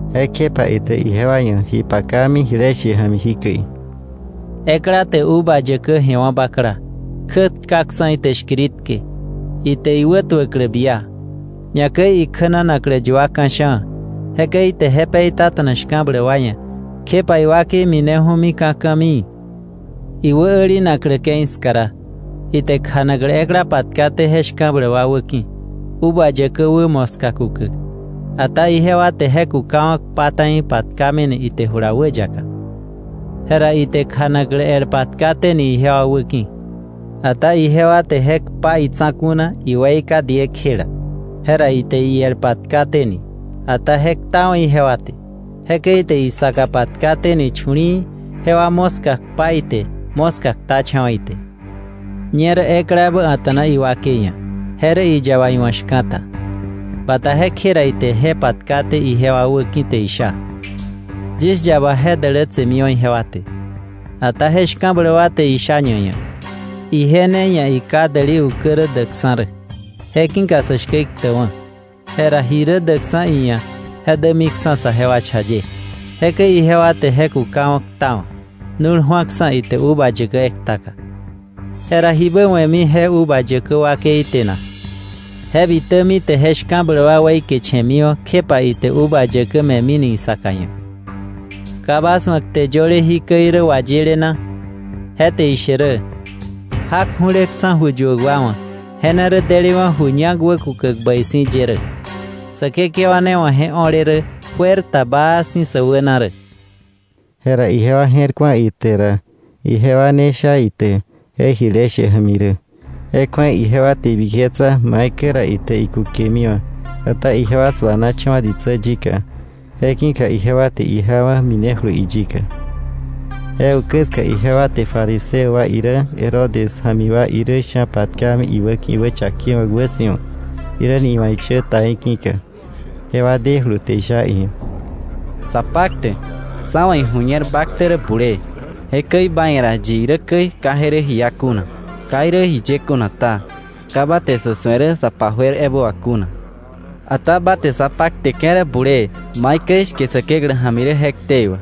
Jekjepa ite ijewa ia̱ ji pakami jile she ja̱mi jikäi: “Ekla te uva yäkä je̱wa̱ bakla, kjätkaksa̱ ite shkiritke, ite iwä wätuäklä bia, ñakäi ikjänanaklä yua ka̱sha̱a̱, jekäi ite je peitata̱na shka̱bläk wa ia̱, kjepa iwakei mineju̱mi ka̱ ka̱mii. Iwä älinaklä ke̱i ska ra, ite kjanaklä ekla patkaté je shka̱bläk wa wäki̱, uva yäkä wä moska kukäk. Ata ijewa te je kukawa̱ kpa ta̱i, patkamini ite jula wäyaka. Jera ite kjanaklä el patkaténi ijewa wäki̱, ata ijewa te je kpa itsa̱ku̱ na, iweika diekjela. Jera ite iel patkaténi, ata je ktawa̱ ijewa te. Jekäi ite isaka patkaténi chu̱li̱i̱, jewa moska kpa ite, moska ktacha̱wa ite. “Ñerä ekla ebä a̱ta̱na iwakei ia̱, je rä iyaba iwa̱ shka̱ta; bata jekje ra ite je patkaté ijewa wäki̱, te isha: ‘Yis yaba je dälätsemiwa̱ ijewa te.’ Ata je shka̱bläk wa te isha ñaia̱: ‘Ije ne ia̱ iká däli ukä rä däkksa̱ rä; je ki̱ka sä shkä iktäkwa̱, jera ji rä däkksa̱ iia̱ je dämiksa̱ saje cha ye.’ Jekäi ijewa te je kukawa̱ ktawa̱, nu̱l ju̱aksa̱ ite uva yäkä ektaka. “Jera ¿jibä we̱mi je uva yäkä wakei te na? Je bitämi te je shka̱bläk wa weikeche̱miwa̱, kjepa ite uva yäkä me̱mini isaka ia̱. “¿Ka bas wa̱ kte yöle jikäi rä wayile na? Je te ishe rä: ‘Jak ju̱leksa̱ ju yuäk wa wa̱, je ne rä delewa̱ ju ñak wäkukäk bäi si̱ ye rä. Säkekewa ne wa̱ je o̱le rä, juer ta baa si̱ sä wäna rä.’” Jera ijewa je̱r ku̱a ite ra ijewa ne sha ite je jile she ja̱mi rä, je kju̱ei ijewa te ibiketsa maikäi ra ite ikukemiwa̱; ata ijewa suanacha̱wa̱ ditsä yika, je ki̱ka ijewa te ijawa̱ minejulu iyika. Je ukä ska ijewa te fariseo wa irä, Herodes ja̱mi wa irä sha̱ patkami iwäki̱ iwächakewa̱k wäsi̱wa, jiräni iwa̱ ishä ta í̱ ki̱ka. Jewa dejulu te isha iia̱: —Sapaktäk, sá wa̱ iju̱ñer ba ktä rä bulee, jekäi ba ia̱ ra yi irä käi, ka je rä ji iá kuna. Ka irä jiye kuna ta, ka ba te sa̱ su̱e rä sa pa juer ebä wà kuna, ata ba te sa pakteke̱ rä bulee maikäi shke Säkeklä ja̱mi rä je ktei wà.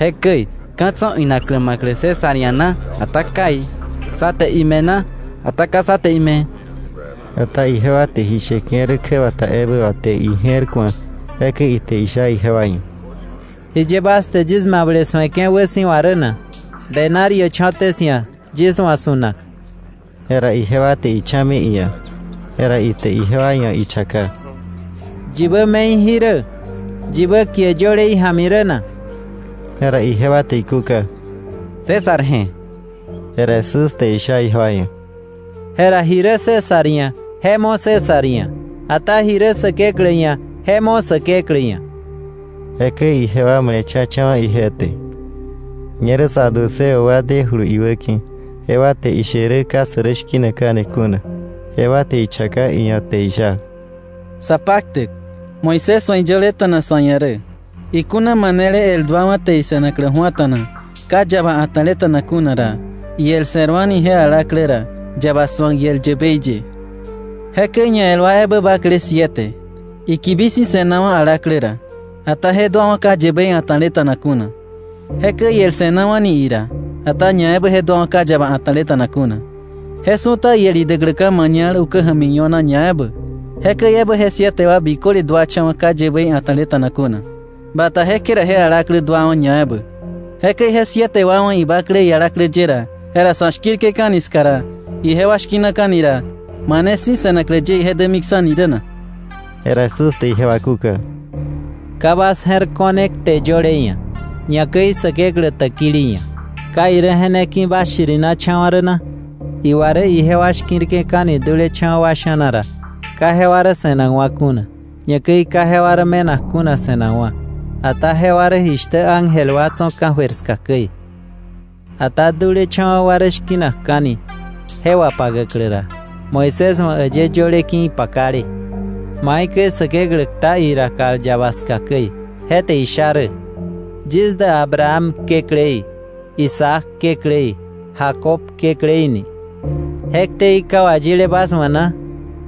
Jekäi ¿ka̱ tso̱ inaklä ma̱klä César ia̱ na, ata kai? ¿Sá te ime̱ na, ata ka sá te ime̱? Ata ijewa te ji sheke̱ rä kjäbata ebä wà te ije̱r ku̱a, jekäi ite isha ijewa ia̱: —¿Jiye bas te yis mable su̱eke̱ wäsi̱wa rä na? Denario cho̱té 'sia̱ yis wa̱ su̱nak. Jera ijewa te icha̱mi iia̱, jera ite ijewa ia̱ ichaka: —¿Yibä me̱i jí rä, yibä kie yöle ija̱mi rä na? Jera ijewa te ikúka: —César je̱. Jera Jesús te isha ijewa ia̱: —Jera ji rä César ia̱ je mo César ia̱, ata ji rä Säkeklä ia̱ je mo Säkeklä ia̱. Jekäi jewa male̱cha̱cha̱wa̱ ije te. Ñerä saduceo wa demijulu iwäki̱. Jewa te ishe rä ka sä rä shki̱nakka̱ni kuna; jewa te ichaka iia̱ te isha: —Sapaktäk, Moisés wa̱ iyöleta̱na sa̱ ia̱ rä: ‘Ikuna manele el duawa̱ te ise̱naklä ju̱ata̱na, ka yaba a̱ta̱leta̱na kuna ra, iel se̱rwa̱ni je alaklä ra, yaba su̱ak iel yäbei ye.’ Jekäi ñael wa ebä bakle siete; ikibi si̱ se̱nawa̱ alaklä ra, ata je duawa̱ ka yäbei a̱ta̱leta̱na kuna. Jekäi iel se̱nawa̱ni ira, ata ñaebä je duawa̱ ka yaba a̱ta̱leta̱na kuna. Je su̱ta iel idäkläka̱ mañal ukä ja̱mi io̱na ñaebä. Jekäi ebä je siete wa biköle duacha̱wa̱ ka yäbei a̱ta̱leta̱na kuna; bata jekje ra je alaklä duawa̱ ñaebä. Jekäi je siete wa wa̱ ibakle ialaklä ye ra, jera sa̱ shki̱rke̱ka̱ni ska ra ijewa shki̱naka̱ni ra, ¿mane si̱ se̱naklä ye ije dämiksa̱ni rä na? Jera Jesús te ijewa kúka: —Ka bas je̱r ko̱ne kte yöle ia̱, ñakäi Säkeklä täkili ia̱; ¿ka irä je ne ki̱ bas shirinacha̱wa̱ rä na? Iwa rä ijewa shki̱rke̱ka̱ni dulecha̱wa̱ wa sha̱na ra, ka jewa rä se̱nakwa̱ kuna, ñakäi ka jewa rä me̱nak kuna se̱nakwa̱, ata jewa rä jishtä ángel wa tso̱ ka̱jöir ska käi. Ata dulecha̱wa̱ wa rä shki̱nakka̱ni je wapakäklä ra, Moisés wa̱ äyë yöle ki̱ ipakale, maikäi Säkeklä kta ira kal yaba ska käi, je te isha rä: ‘Yis dä Abraham Kekläí, Isaac Kekläí, Jacob Kekläí’ ni ¿je ktei ka wayíle bas wa̱ na?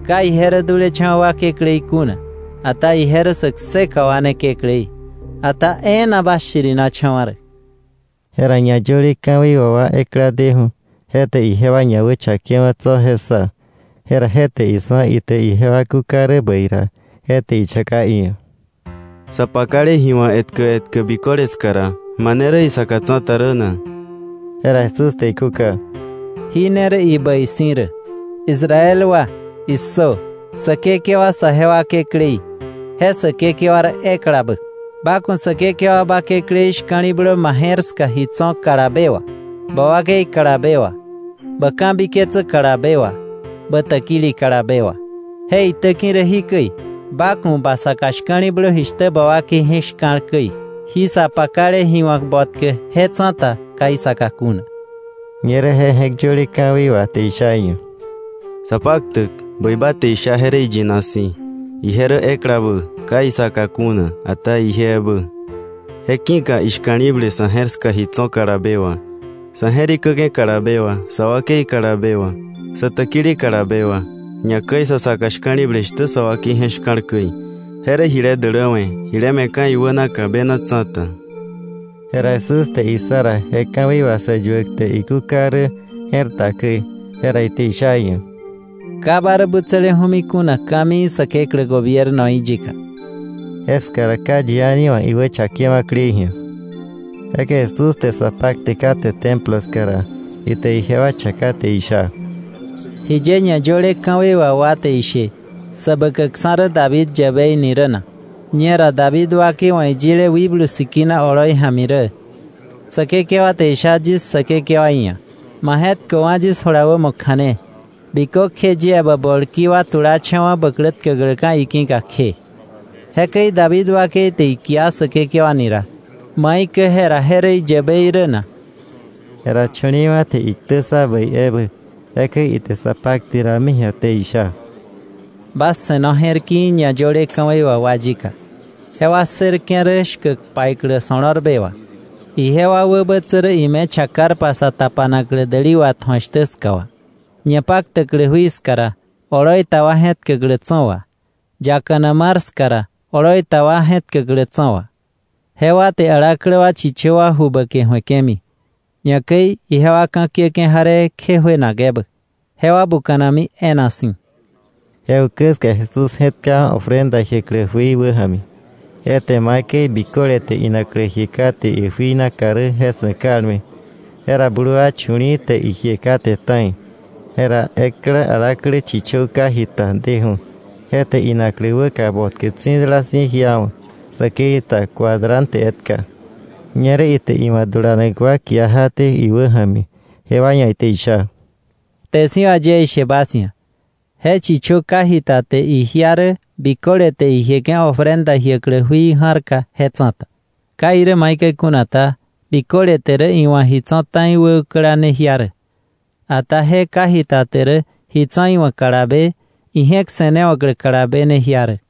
Ka ije rä dulecha̱wa̱ wa Kekläí kuna, ata ije rä sä kseka wa ne Kekläí. Ata e̱e̱na bas shirinacha̱wa̱ rä. Jera ñayöle ka̱wei wà wa ekla deju̱, je te ijewa ñawächake̱wa̱ tso̱ je ssa. Jera je te isu̱a ite ijewa kúka rä bäi ra, je te ichaka iia̱: —¿Sa pakale ji wa̱k etkä etkä biköle ska ra, mane rä isaka tsa̱ta rä na? Jera Jesús te ikúka: —Jí ne rä ibäi si̱ rä: ‘¡Israel wa, issö! Säkekewa saje wa Kekläí, je Säkekewa rä eklabä. Ba ku̱ Säkekewa ba Kekläí shka̱li̱blö ma je̱r ska ji tso̱ kalabe wà, ba wakei kalabe wà, bä ka̱biketsä kalabe wà, bä täkili kalabe wà.’ Je itäki̱ rä jikäi: ‘Ba ku̱ ba saka shka̱li̱blö jishtä ba wakei je̱k shka̱l käi.’ Jí sa pakale ji wa̱k botkä je tsa̱ta ka isaka kuna. Ñerä je je̱k yöle ka̱wei wà te isha ia̱: —Sapaktäk, bäi ba te isha je rä iyina si̱, ije rä eklabä, ka isaka kuna, ata ije ebä. Je ki̱ka ishka̱li̱ble sa̱ je̱r ska ji tso̱ kalabe wà, sa̱ je̱rikäke̱ kalabe wà, sa wakei kalabe wà, sä täkili kalabe wà, ñakäi sa saka shka̱li̱ble jishtä sa wakei je̱k shka̱l käi, je rä jile däläwe̱, jile me̱ka̱ iwänaka bena tsa̱ta. Jera Jesús te issa ra je ka̱wei wà sä yuäk te ikúka rä je̱r ta käi, jera ite isha iia̱: —Ka ba rä butsäleju̱mi kuna ka̱mii Säkeklä gobiernoí yika. Jeska ra ka yi a̱ni wa̱ iwächakewa̱klei ji̱a. Jekäi Jesús te sa pakte kate Templo ska ra, ite ijewa chaka te isha: —¿Jiye ñayöle ka̱wei wà wa te ishe Säbäkäkksa̱ rä David yäbei ni rä na? Ñera David wakei wa̱ iyile Wikblu Sikina oloi ja̱mi rä: “Säkekewa te isha yis Säkekewaí ia̱: Ma je̱tköwa̱ yis jula wämo kja̱ne, bikökje yie bä bolki wa tulacha̱wa̱ bä klä tkäkläka̱ iki̱ka kje.” Jekäi David wakei te ikia Säkekewa ni ra, ¿maikäi jera je rä iyäbei rä na? Jera chu̱li̱i̱wa̱ te iktä ssa bäi ebä. Jekäi ite sa pakte rami ji̱a te isha: “Bas se̱no je̱r ki̱i̱ ñayöle ka̱wei wà wa yika. Jewa ssërke̱ rä shkäk paiklä so̱lo̱rbe wà, ijewa wäbätsä rä ime chakarpa sa tapanaklä däli watju̱ak shtä ska wà, ñapaktäklä jui ska ra, oloi ta wa je̱tkäklä tso̱ wà, yakana mar ska ra, oloi ta wa je̱tkäklä tso̱ wà. Jewa te alaklä wa chichö wa ju bäke ju̱eke̱mi, ñakäi ijewa ka̱kiäke̱ jaree kje juenak ebä. Jewa buka̱nami e̱e̱na si̱.” Je ukä ska Jesús je̱tkawa̱ ofrenda jiäklä jui wäja̱mi, je te maikäi biköle te inaklä jie kate ijui naka rä je su̱e kalme. Jera blu wa chu̱li̱i̱ te ijie kate ta̱i. Jera ekla alaklä chichö ka jita deju̱, je te inaklä wäka botkä tsi̱dala si̱ jiawa̱, säkei ta cuadrante etka. Ñerä ite iwa̱ dulanak wa kia jaté iwäja̱mi, jewa ia̱ ite isha: —Kte si̱ wà yie ishe bas ia̱, je chichö ka jita te ijia rä biköle te ijieke̱ ofrenda jiäklä jui ja̱rka je tsa̱ta. Ka irä maikäi kuna ta, biköle te rä iwa̱ ji tso̱ ta̱i wäukäla ne jia rä, ata je ka jita te rä ji tso̱ iwa̱ kalabe, ije̱k se̱newa̱klä kalabe ne jia rä.